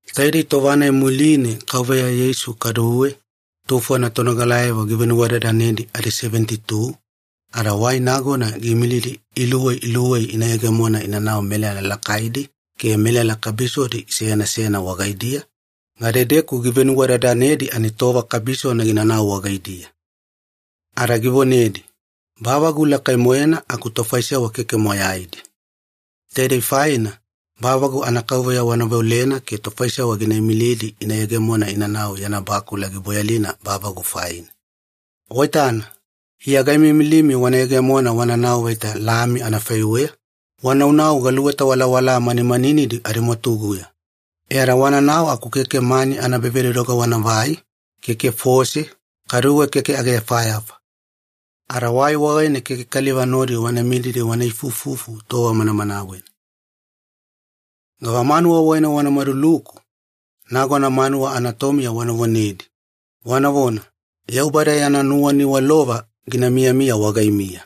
Taidei tova-nai muline Kauveya Yeisu kaduwe tufona tonogalayavo givenuwadadanedi adiseveniti-tu, ada wai nagona giimilidi iluwei iluwei ina yegemona inanau melala lakaidi ke melala kabisodi seyana seyana wagaidiya, gadedeku givenuwadadanedi ani tova kabisona ginanau wagaidiya. Ada givonedi, “Bavagu lakai-moena aku tofaisewa keke moyaidi. Taidei faina bavagu anaKauveya wana veolena ke tofaisewa gina imilidi ina yegemona inanau yana bakula giboyalina bavagu faina. Waitana, Iya gaimiimilimi wana yegemona wananau vaita lami anafaiweya, wanaunau galuweta walawala manimaninidi adimwatuguya. E ada wananau aku keke mani anaebavedodoga wanavai, keke fose, kaduwe keke ageyafayafa. Ada wai wagaine keke kaliva nodi wana mididi wana ifuifufu tova manamanawena. “Gavamanuwa wagaine wanaluku, nagona manuwa anatomiya wana vonedi, wanavona, ‘Yaubada yana nuwaniwalova gina miyamiya wagaimiya.’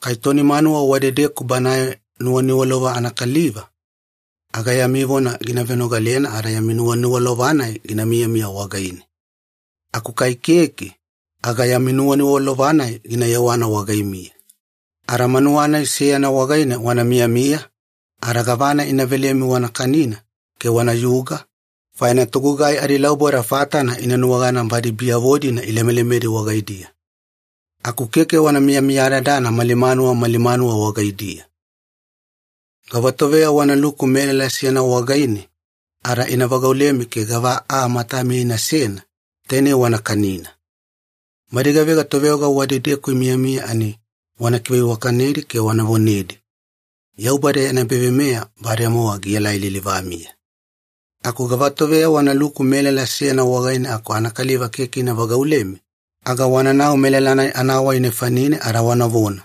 Kai toni manuwa wadedeku banae nuwaniwalova anakaliva, aga yami vona gina venogalena ada yami nuwaniwalova-nai ginamiya wagaine. Aku kai keke, aga yami nuwaniwalova-nai gina yewana wagaimiya. Ada manuwa-nai seyana wagaine wana miyamiya, ada gavana ina velemi wana kanina ke wanayuga, faina togugai adilauboda fatana ina nuwagana badi biyavo-dina ilemelemedi wagaidiya. Aku keke wana miyamiyadadana mali manuwa mali manuwa wagaidiya. “Gavatoveya wanaluku melala seyana wagaine ada ina vagaulemi ke gava aa matamiya inasena, tainei wana kanina. Badi gavega toveoga wadedeku imiyamiya ani wana kiveiwakanedi ke wana vonedi, ‘Yaubada yana ebaveimeya bademowa gielai lilivamiya.’ Aku gavatoveya wanaluku melala seyana wagaine aku anakaliva keke ina vagaulemi, aga wananau melala-nai anawai nefanine ada wanavona,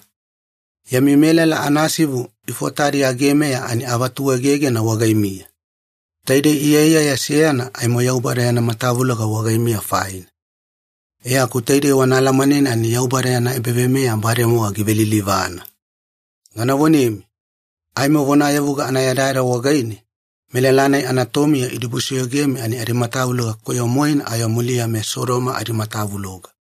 ‘Yami melala anasivu ifotadi agemeya ani avatuegegena wagaimiya. Taidei iyaiyaya seyana aimo Yaubada yana matavuloga wagaimiya faina. E aku taidei wana alamanena ani Yaubada yana ebaveimeya bademowa givelilivana.’ Gana vonemi, aimo vonayavuga anayadayada wagaine, melala-nai anatomiya idibusoyogemi ani adimatavuloga koyo-moena ayo muliya meSodoma adimatavuloga.”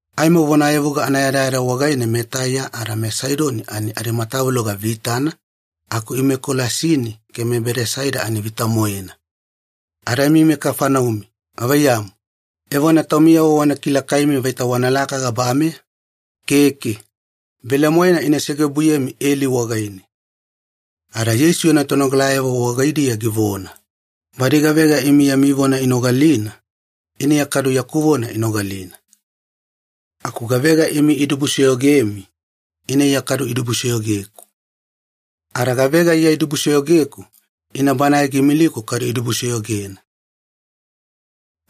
Aimo vonayavuga anayadayada wagaine meTaiya ada meSaidoni ani adimatavuloga vitana, aku imi meKolasini ke meBedasaida ani vita-moena. Ada imi meKafaneumi, gavaiyamu, evona taumiyavo wana kilakaimi vaita wanalaka gabameya? Keke! Velemoena ina segeobuyemi eli wagaine.” Ada Yeisu yana tonogalayavo wagaidiya givona, “Badi gavega imi yami vona inogalina, ina Iya kadu yaku vona inogalina. Aku gavega imi idibusoyogemi, ina Iya kadu idibusoyogeku. Ada gavega Iya idibusoyogeku, ina Banae giimiliku kadu idibusoyogena.”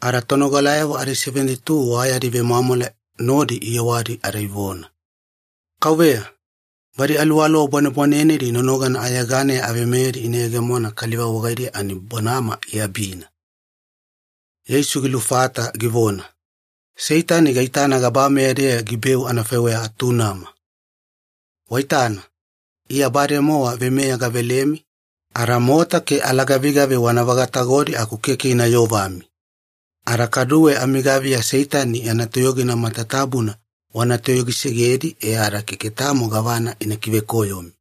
Ada tonogalayavo adiseveniti-tu wa yadi vemwamwala nodi iyewadi ada ivona, “Kauveya, badi aluwaluwa bwanebwanenedi nonogana ayeganeya aveimeyedi ina yegemona kaliva wagaidiya ani bonama iabina.” Yeisu gilufata givona, “Seitani gaitana gabameya-deya gibeu anafaiweya atunama. Waitana, Iya bademowa veimeya gavelemi ada mota ke alagavigavi wana vagatagodi aku keke ina yovami. Ada kaduwe amigaviya Seitani yana toyogina matatabuna wana toyogisegedi e ada keke tamo gavana ina kivekoyomi.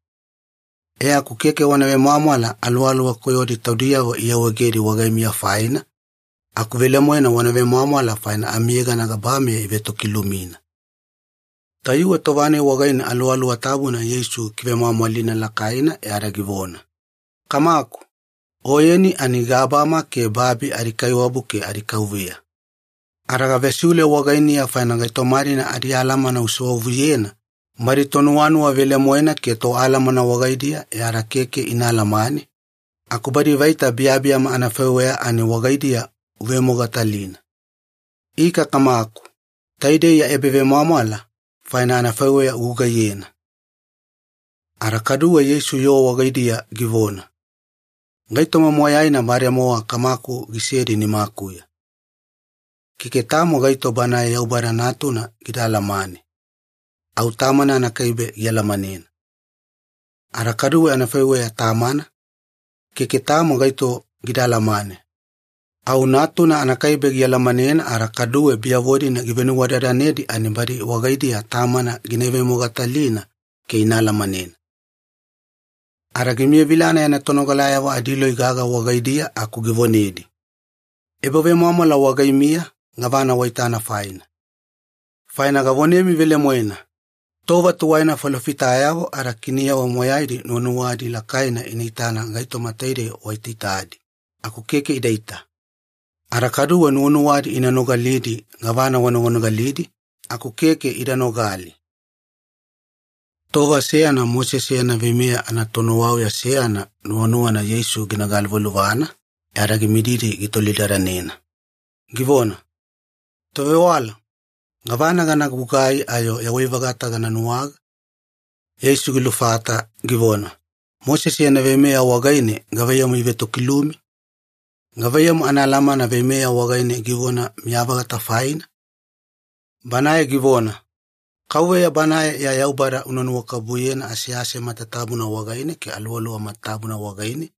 E aku keke wana vemwamwala aluwaluwa koyodi taudiyavo iawaegedi wagaimiya faina, aku velemoena wana vemwamwala faina amiyegana gabameya ivetokilumina.” Tayuwe tova-nai wagaine Aluwaluwa Tabuna Yeisu gikivemwamwalina lakaina e ada givona, “Kamaku, Oyeni ani gabama ke babi adiKaiwabu ke adiKauveya, ada gavesiule wagainiya faina gaitoma-dina adialamana usewavuyena badi tonuwanuwa velemoena ke toalamana wagaidiya e ada keke ina alamane, aku badi vaita biyabiyama anafaiweya ani wagaidiya uivemogatalina. Ika Kamaku, taidei ya ebavemwamwala faina anafaiweya ugugaiyena.” Ada kaduwe Yeisu yoo wagaidiya givona, “Gaitoma moyaina bademowa Kamaku gisedi nimakuya. Keke tamo gaito Banae Yaubada Natuna gida alamane, au Tamana anakaibe gialamanena. Ada kaduwe anafaiweya Tamana, keke tamo gaito gida alamane, au Natuna anakaibe gialamanena ada kaduwe biyavo-dina givenuwadadanedi ani badi wagaidiya Tamana gina ivemogatalina ke ina alamanena.” Ada gimiyavilana yana tonogalayavo adiloi gaga wagaidiya aku givonedi, “Ebavemwamwala wagaimiya gavana waitana faina. Faina gavonemi velemoena, tova tuwaina falofitayavo ada kiniyavo moyaidi nuwanuwadi lakaina ina itana gaitoma taidei waitaitadi, aku keke idaita. Ada kaduwe nuwanuwadi ina nogalidi gavana wanoganogalidi, aku keke ida nogali.” Tova seyana Mosese yana veimeya anatonuwauya seyana nuwanuwana Yeisu gina galuvaluvana, e ada gimididi gitolidadanena, givona, “Tovewala, gavana gana gugai ayo yawai-vagata gana nuwaga?” Yeisu gilufata, givona, “Mosese yana veimeya wagaine gavaiyamu ivetokilumi? Gavaiyamu anaalamana veimeya wagaine givona miya-vagata faina?” Banae givona, “KAUVEYA Banae ya Yaubada una nuwakabubuyena asease matatabuna wagaine ke aluwaluwa matatabuna wagaine,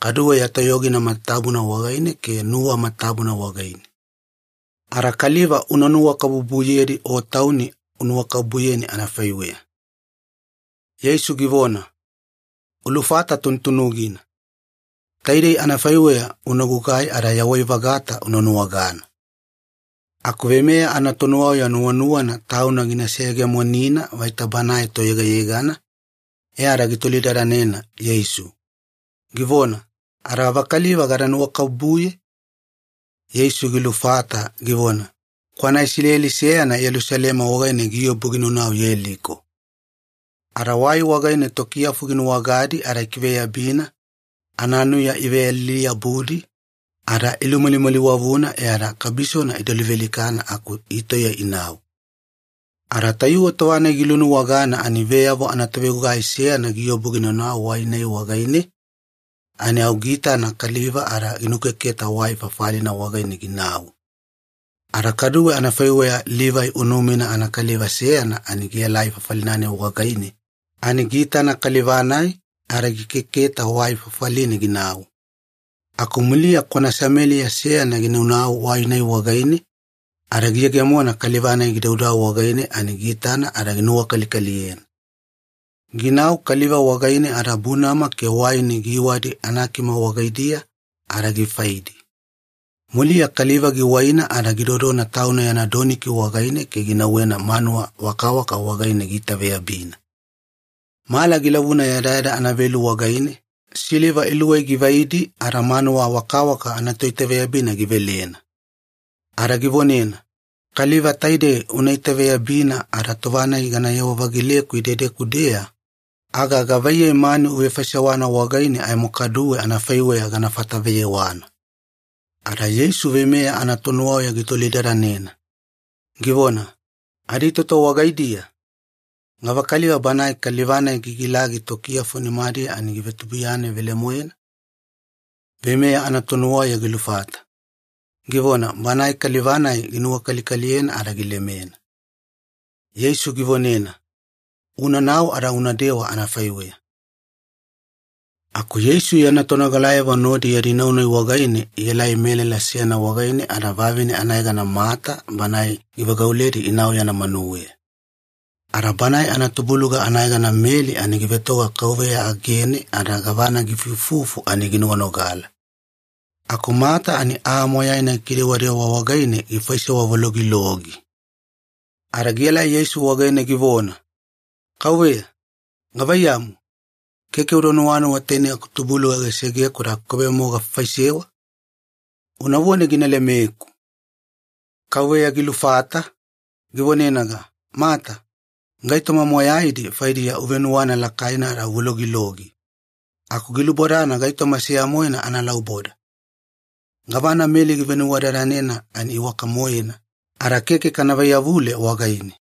kadu ya toyogina matatabuna wagaine ke nuwa matatabuna wagaine. Ada kaliva una nuwakabubuyedi o tauni unuwakabubuyeni anafaiweya.” Yeisu givona, “Ulufata tunutunugina. Taidei anafaiweya una gugai ada yawai-vagata una nuwagana.” Aku veimeya anatonuwauya nuwanuwana tauna gina seyegemonina vaita banae toyegayegana, e ada gitolidadanena Yeisu, givona, “Ada gavakaliva gada nuwakabubuye?” Yeisu gilufata, givona, “Kwana Isileli seyana Yelusalema wagaine giobu ginaunau Yeliko. Ada wai wagaine tokiyafu ginuwagadi ada ikiveyabina, ananuya iveyalili-yabudi, ada ilumalimaliwavuna e ada kabisona ida luvealikana aku itauya inau. Ada tayuwe tova-nai gilunuwagana ani veyavo anatovegugai seyana giobu ginaunau wai-nai wagaine, ani au giitana kaliva ada ginukeketa wai fafalina wagaine ginau. Ada kaduwe anafaiweya Livai unumina anakaliva seyana ani gielai fafali-nai wagaine ani giitana kaliva-nai ada gikeketa wai fafaline ginau. Aku muliya kwana Sameliya seyana ginaunau wai-nai wagaine, ada giyegemona kaliva-nai gidaudau wagaine ani giitana ada ginuwakalikaliyena. Ginau kaliva wagaine ada bunama ke waini giiwadi anakima wagaidiya ada gifaidi. Muliya kaliva giwaina ada gidodona tauna yana doniki wagaine ke ginauwena manuwa wakawaka wagaine giitaveyabina. Mala gilavuna yadayada anavelu wagaine, siliva iluwei givaidi ada manuwa wakawaka anatoitaveyabina givelena. Ada givonena, ‘Kaliva taidei una itaveyabina ada tova-nai ganayewa-vagileku idedeku-deya, aga gavaiyei mani uvefaisewana wagaine aimo kaduwe anafaiweya gana fataveyewana.’” Ada Yeisu veimeya anatonuwauya gitolidadanena, givona, “Aditoto wagaidiya, gavakaliva banae kaliva-nai gigilagi tokiyafu nimadiya ani givetubuiyanena velemoena?” Veimeya anatonuwauya gilufata, givona, “Banae kaliva-nai ginuwakalikaliyena ada gilemena.” Yeisu givonena, “Unanau ada una dewa anafaiweya.” Aku Yeisu yana tonogalayavo nodi yadi nau-nai wagaine ielai melala seyana wagaine ada vavine anayegana Mata banae givagauledi inau yana manuweya. Ada banae anatubuluga anayegana Meli ani givetoga Kauveya agene ada gavana giifuifufu ani ginoganogala. Aku Mata ani aa moyaina gikidewadewa wagaine gifaisewa vologilogi. Ada gielai Yeisu wagaine givona, “Kauveya, gavaiyamu, keke uda nuwanuwa tainei akutubuluga gisegeku ada akukaibe-mowa gafaifaisewa? Unavone gina lemeku!” Kauveya gilufata, givonenaga, “Mata, gaitoma moyaidi faidiya uvenuwana lakaina ada uvologilogi, aku gilubodana gaitoma seya-moena analauboda. Gavana Meli givenuwadadanena ani iwaka-moena, ada keke kana vaiyavule wagaine.”